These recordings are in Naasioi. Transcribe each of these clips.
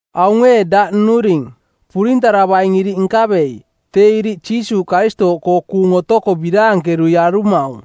Aung ee daꞌ nnuring, purintaravaing iriꞌ nkavei, tee iriꞌ Jiisuuꞌ Karistooꞌkoo kuung otoko biraankerui arumaung.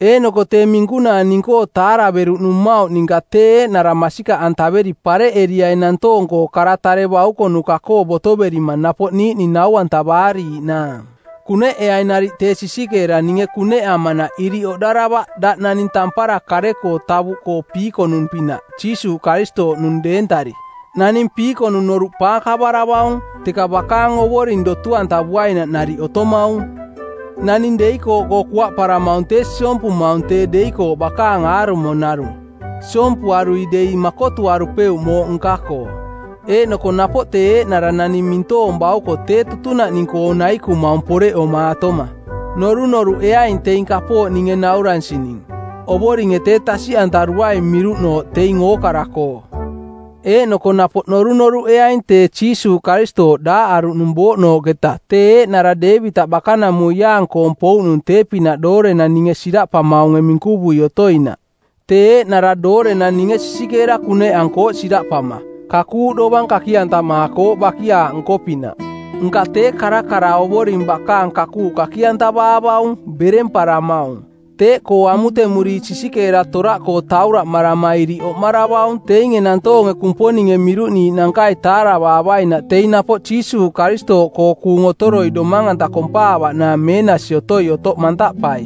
Eeꞌnoko tee minkunaa ning-koo taaraveruꞌnung mmauꞌ ninka tee eeꞌnara masikaꞌantaveri pareꞌeriai nantoong-koo kara tare baukonuka-koo botoverima napoꞌ niiꞌning nau-antavaariiꞌnaang. Kuneꞌeaing nariꞌ tee sisikeera ninge kuneꞌamanaꞌ iriꞌ oꞌdaravaꞌ daꞌ naning tampara kare-koo tavuꞌkoo piikonung-pinaꞌ Jiisuuꞌ Karistooꞌnung deentari. Naning piikonung noruꞌ paakavaravaung, teka bakaang ovoring dotu-antavuainaꞌ nariꞌ otomaung. Naning deikooꞌkoo kuaꞌparamaung tee siompumaung tee deikooꞌ bakaang aarumo narung. Siompuarui dei makotuarupeuꞌ mooꞌ nka-koo. Eeꞌnoko napoꞌ tee eeꞌnara naning mintoong bauko tee tutunaꞌning-koo naikumaung poreꞌomaatoma. Norunoruꞌeaing teing kapooꞌ ninge nauransining. Ovoringe tee tasiꞌantaruaing miruꞌnooꞌ teing ookara-koo. Eeꞌnoko napoꞌ norunoruꞌeaing tee Jiisuuꞌ Karistooꞌ daaꞌaruꞌnung bouꞌnooꞌketa tee eeꞌnara Deevitaꞌ bakanamuiaang-koong pouꞌnung tee-pinaꞌ doorenang ninge siraꞌpamaunge minkuvui otoinaꞌ. Tee eeꞌnara doorenang ninge sisikeera kuneꞌankooꞌ siraꞌpama, kakuuꞌ dovang kaki-antamaakooꞌ bakiaaꞌ nko-pinaꞌ. Nka tee karakara Ovoring bakaang kakuuꞌ kaki-antavaavaung, beremparamaung. Teeꞌkoo amutemuriiꞌ sisikeera toraꞌkoo tauraꞌmarama iriꞌ oꞌmaravaung teinge nantoonge Kumponinge miruꞌniiꞌnankai taaravaavainaꞌ teing napoꞌ Jiisuuꞌ Karistooꞌkoo kuung otoroi domang-anta kompaavaꞌnaang meenasi otoi otoꞌ mantaꞌpai.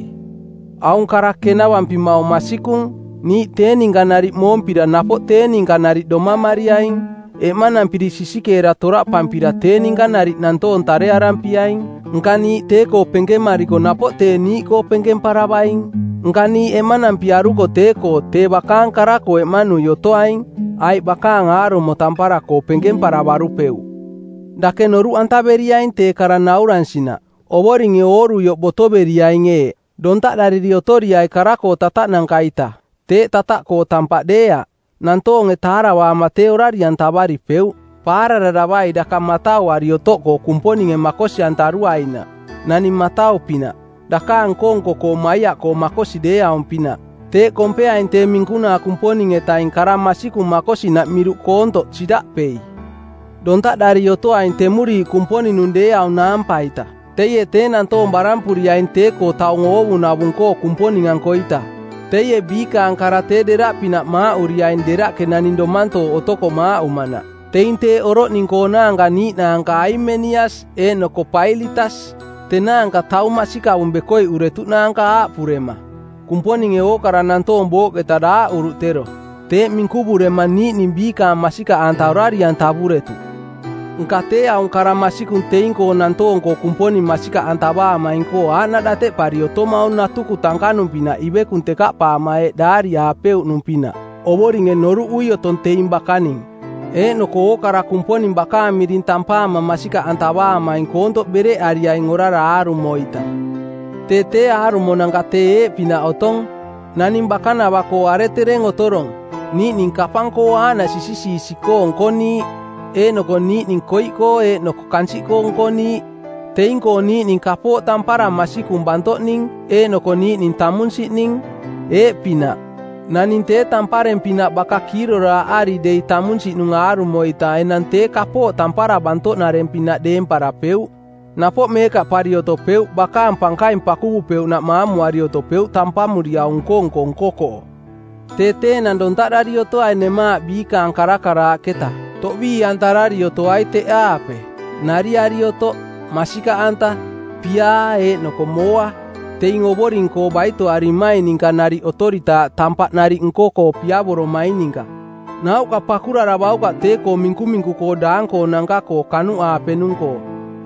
Aung kara kenavampimaung masikung: Niiꞌ tee ninka nariꞌ moompira Napoꞌ tee ninka nariꞌ domamariaing. Eꞌmanampiri sisikeera toraꞌpampira Tee ninka nariꞌ nantoong tarearampiaing. Nka niiꞌ tee-koo penkemariko Napoꞌ tee niiꞌkoo penkemparavaing. Nka niiꞌ eꞌmanampiaruko tee-koo Tee bakaang kara-koo eꞌmanui otoaing, Aiꞌ bakaang aarumo tampara-koo penkemparavarupeuꞌ. Dake noruꞌantaveriaing tee kara nauransinaꞌ. Ovoringe oorurioꞌ botoveriaing eeꞌ: Dontaꞌdariri otoriai kara-koo tataꞌnanka-ita. Teeꞌ tataꞌkoo tampaꞌ deeaꞌ. Nantoonge taaravaama tee orari-antavaripeuꞌ. Paarararavai daka matauari otoꞌkoo Kumponinge makosi-antaruainaꞌ, naning matau-pinaꞌ, dakaang nko-nko-koo maiaꞌkoo makosi deeaung-pinaꞌ. Teeꞌ kompeaing tee minkunaa Kumponing-etaing kara masikung makosinaꞌ miruꞌ koontoꞌ siraꞌpei. Dontaꞌdari otoaing temuriiꞌ Kumponing-nung deeaung naampa-ita. Teie tee nantoong barampuriaing tee-koo taung oovunavung-koo Kumponing-ankoita. Teie biikaang kara tee deraꞌpinaꞌ maaꞌuriaing deraꞌke naning domantooꞌ otoko maaꞌumanaꞌ. Teing teeꞌ oroꞌning-koonaanka niiꞌnaanka Haimenias eeꞌnoko Pailitas. Tenaanka taung masikavung bekoiꞌuretuꞌnaanka aaꞌpurema, “Kumponinge ookara nantoong booꞌketa daaꞌuruꞌ tero.” Teeꞌ minkuvurema niiꞌning biikaang masikaꞌanta orari-antavuretuꞌ. Nka tee aung kara masikung teing-koo nantoong-koo Kumponing masikaꞌantavaamaing-koo aaꞌnaꞌ dateꞌpari otomaung natuku tankanung-pinaꞌ ivekung tekaꞌpaama eeꞌ daariaapeuꞌnung-pinaꞌ, “Ovoringe noruꞌui otong teing bakaning, eeꞌnoko ookara Kumponing bakaang miring tampaama masikaꞌantavaamaing koontoꞌ bereꞌariaing orara aarumo-ita.” Tee tee aarumonanka tee eeꞌpinaꞌ otong: Naning bakanava-koo aretereng otorong, niiꞌning kapang-koo aaꞌnaꞌ sisisiisi-koo nkoniiꞌ, eeꞌnoko niiꞌning koiꞌkoo eeꞌnoko kansiꞌkoo nkoniiꞌ. Teing-koo niiꞌning kapooꞌ tampara masikung bantoꞌning eeꞌnoko niiꞌning tamunsiꞌning. Eeꞌpinaꞌ: Naning tee tampareng-pinaꞌ baka kiiroraaꞌari dei tamunsiꞌnung aarumo-ita enang tee kapooꞌ tampara bantoꞌnareng-pinaꞌ deemparapeuꞌ; napoꞌ meekaꞌpari otopeuꞌ, bakaang pankaing pakuvupeuꞌnaꞌ maamuari otopeuꞌ tampamuriau nko-nko nko-koo. Tee tee enang dontaꞌdari otoai nemaaꞌ biikaang karakaraaꞌketa. Toꞌbii-antarari otoai teꞌaape: nariari otoꞌ, masikaꞌanta, piaa eeꞌnoko mooa, teing Ovoring-koo baitoarimaing ninka nariꞌ otoritaaꞌ tampaꞌ nariꞌ nko-koo piavoromaing ninka. Nauꞌka pakuraravaukaꞌ tee-koo minkuminku-koo daang-koonanka-koo kanuꞌaapenung-koo.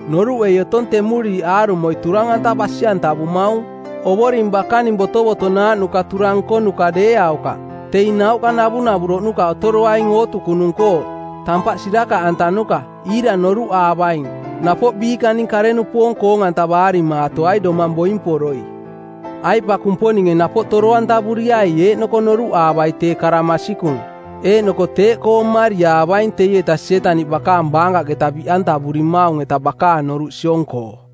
Noruꞌei otong temuriiꞌ aarumoi turang-anta basi-antavumaung. Ovoring bakaning botovotonaaꞌnuka turang nkonuka deeaukaꞌ. Teing nauꞌka navunavuroꞌnuka otoroaing ootukunung-koo, tampaꞌ sirakaꞌantanuka, iira noruꞌaavaing, napoꞌ biikaning kare-nupoong koong-antavaarimaatoai domang boimporoi. Aiꞌ pa Kumponinge napoꞌ toro-antavuriai eeꞌnoko noruꞌaavai tee kara masikung. Eeꞌnoko teeꞌkoo mmariaavaing teieta Sietaniꞌ bakaang baankaꞌketa biꞌantavurimaung-eta bakaang noruꞌ siong-koo.